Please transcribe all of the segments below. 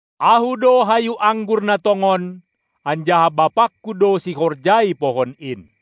Ahu do hayu anggur na tongon, anjaha BapaKu do sihorjai pohon in.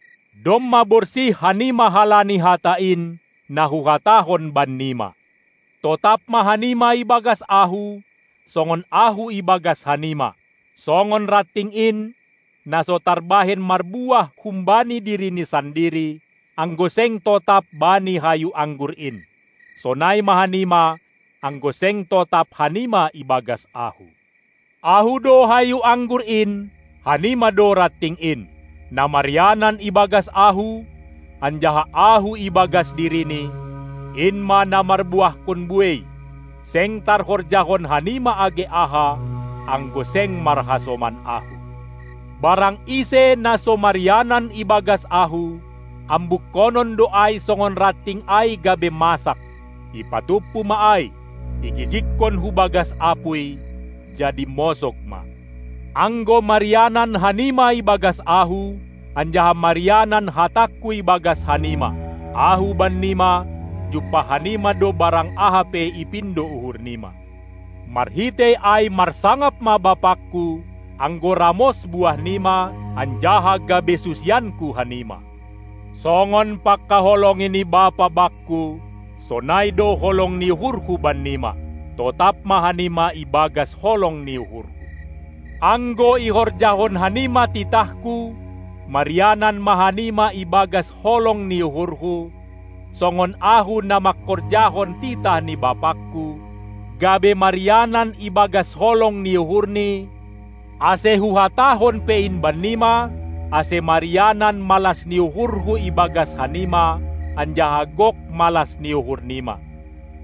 Domma borsih hanima halani hata in, na Huhatahon bannima. Totap ma hanima ibagas Ahu, songon Ahu ibagas hanima! Songon ranting in, na so tarbahen marbuah humbani dirini sandiri, anggo seng totap bani hayu anggur in, sonai ma hanima, anggo seng totap hanima ibagas Ahu. Ahu do hayu anggur in, hanima do ranting in. Na marianan ibagas Ahu, anjaha Ahu ibagas dirini, in ma na marbuahkon buei, seng tarhorjahon hanima age aha, anggo seng marhasoman Ahu. Barang ise, na so marianan ibagas Ahu, ambukkonon do ai songon ranting ai gabe masak; ipatumpu ma ai, igijigkon hubagas apuy, jadi mosog ma. Anggo marianan hanima ibagas Ahu, anjaha marianan hatangKu ibagas hanima, Ahu bannima, jumpah hanima do barang aha pe ipindo uhur nima. Marhitei ai marsangap ma BapangKu, anggo ramos buah nima, anjaha gabe susianKu hanima. Songon pangkaholongi ni Bapa Bakku, sonai do holong ni uhurHu bannima. Totap ma hanima ibagas holong ni uhurHu. Anggo ihorjahon hanima titahKu, marianan ma hanima ibagas holong ni uhurHu, songon Ahu na mangkorjahon titah ni BapaKu, gabe marianan ibagas holong ni uhurNi, Ase Huhatahon pe in bannima, ase marianan malas ni uhurHu ibagas hanima, anjaha gok malas ni uhur nima.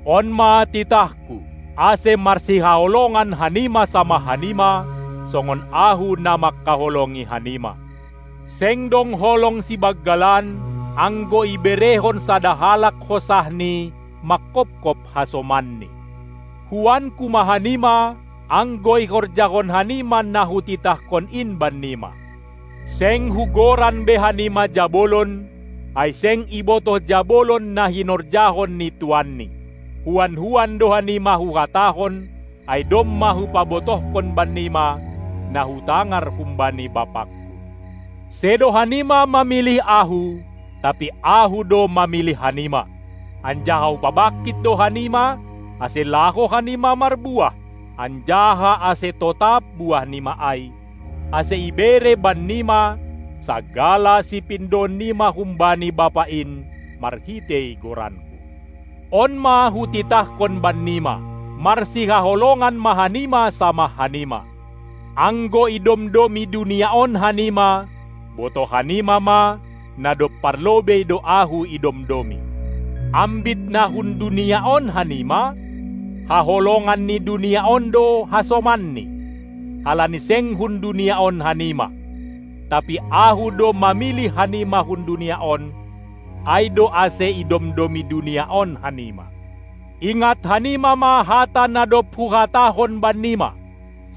On ma titahKu, ase marsihaholongan hanima samah hanima, songon Ahu na mangkaholongi hanima. Seng dong holong sibanggalan, anggo iberehon sada halak hosahni mangkopkop hasomanni. Huanku ma hanima, anggo ihorjahon hanima na Hutitahkon in bannima. Seng Hugoran be hanima jabolon, ai seng ibotoh jabolon na hinorjahon ni tuanni; huan-huan do hanima Huhatahon, ai domma Hupabotohkon bannima, na Hutangar humbani BapaKu. Sedo hanima mamilih Ahu, tapi Ahu do mamilih hanima, anjaha Hupabangkit do hanima, ase laho hanima marbuah, anjaha ase totap buahnima ai, ase ibere bannima sagala sipindoon nima humbani Bapa in marhitei goranKu. On ma Hutitahkon bannima: Marsihaholongan ma hanima samah hanima! Anggo idomdomi dunia on hanima, botoh hanima ma, na dob parlobei do Ahu idomdomi. Ambit na hun dunia on hanima, haholongan ni dunia on do hasomanni, halani seng hun dunia on hanima, tapi Ahu do mamilih hanima hun dunia on, ai do ase idomdomi dunia on hanima. Ingat hanima ma hata na dob Huhatahon bannima: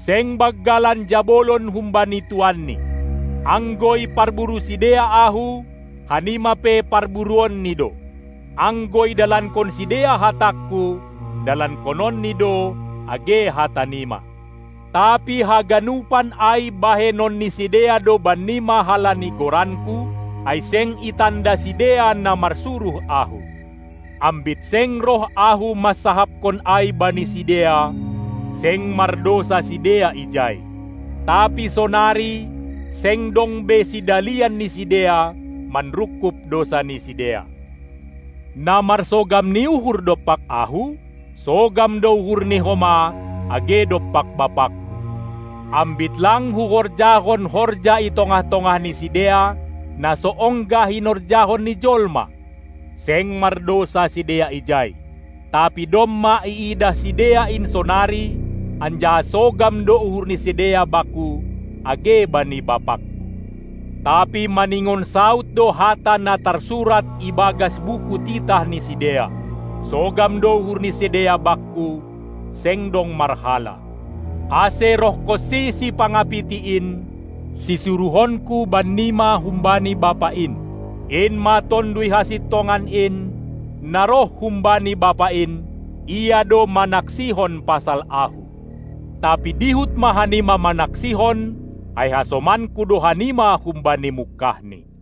Seng banggalan jabolon humbani tuanni. Anggo iparburu sidea Ahu, hanima pe parburuonni do. Anggo idalankon sidea hatangKu, dalankononni do age hata nima. Tapi haganupan ai bahenon ni sidea do bannima halani goranKu, ai seng itanda sidea na marsuruh Ahu. Ambit seng roh Ahu mansahapkon ai bani sidea, seng mardousa sidea ijai; tapi sonari seng dong be sidalian ni sidea manrungkub dousa ni sidea. Na marsogam ni uhur dompak Ahu, sogam do uhurni homa age dompak BapaKu. Ambit lang Huhorjahon horja i tongah-tongah ni sidea, na so ongga hinorjahon ni jolma, seng mardousa sidea ijai; tapi domma iidah sidea in sonari, anjaha sogam do uhur ni sidea Bakku age bani BapaKu. Tapi maningon saud do hata na tarsurat ibagas buku titah ni sidea: Sogam do uhur ni sidea Bakku, seng dong marhala! Ase rohhonsi Sipangapiti in, sisuruhonKu bannima humbani Bapa in, in ma Tonduy Hasintongan in, na roh humbani Bapa in, Ia do manaksihon pasal Ahu. Tapi dihut ma hanima manaksihon, ai hasomanKu do hanima humbani mungkahni.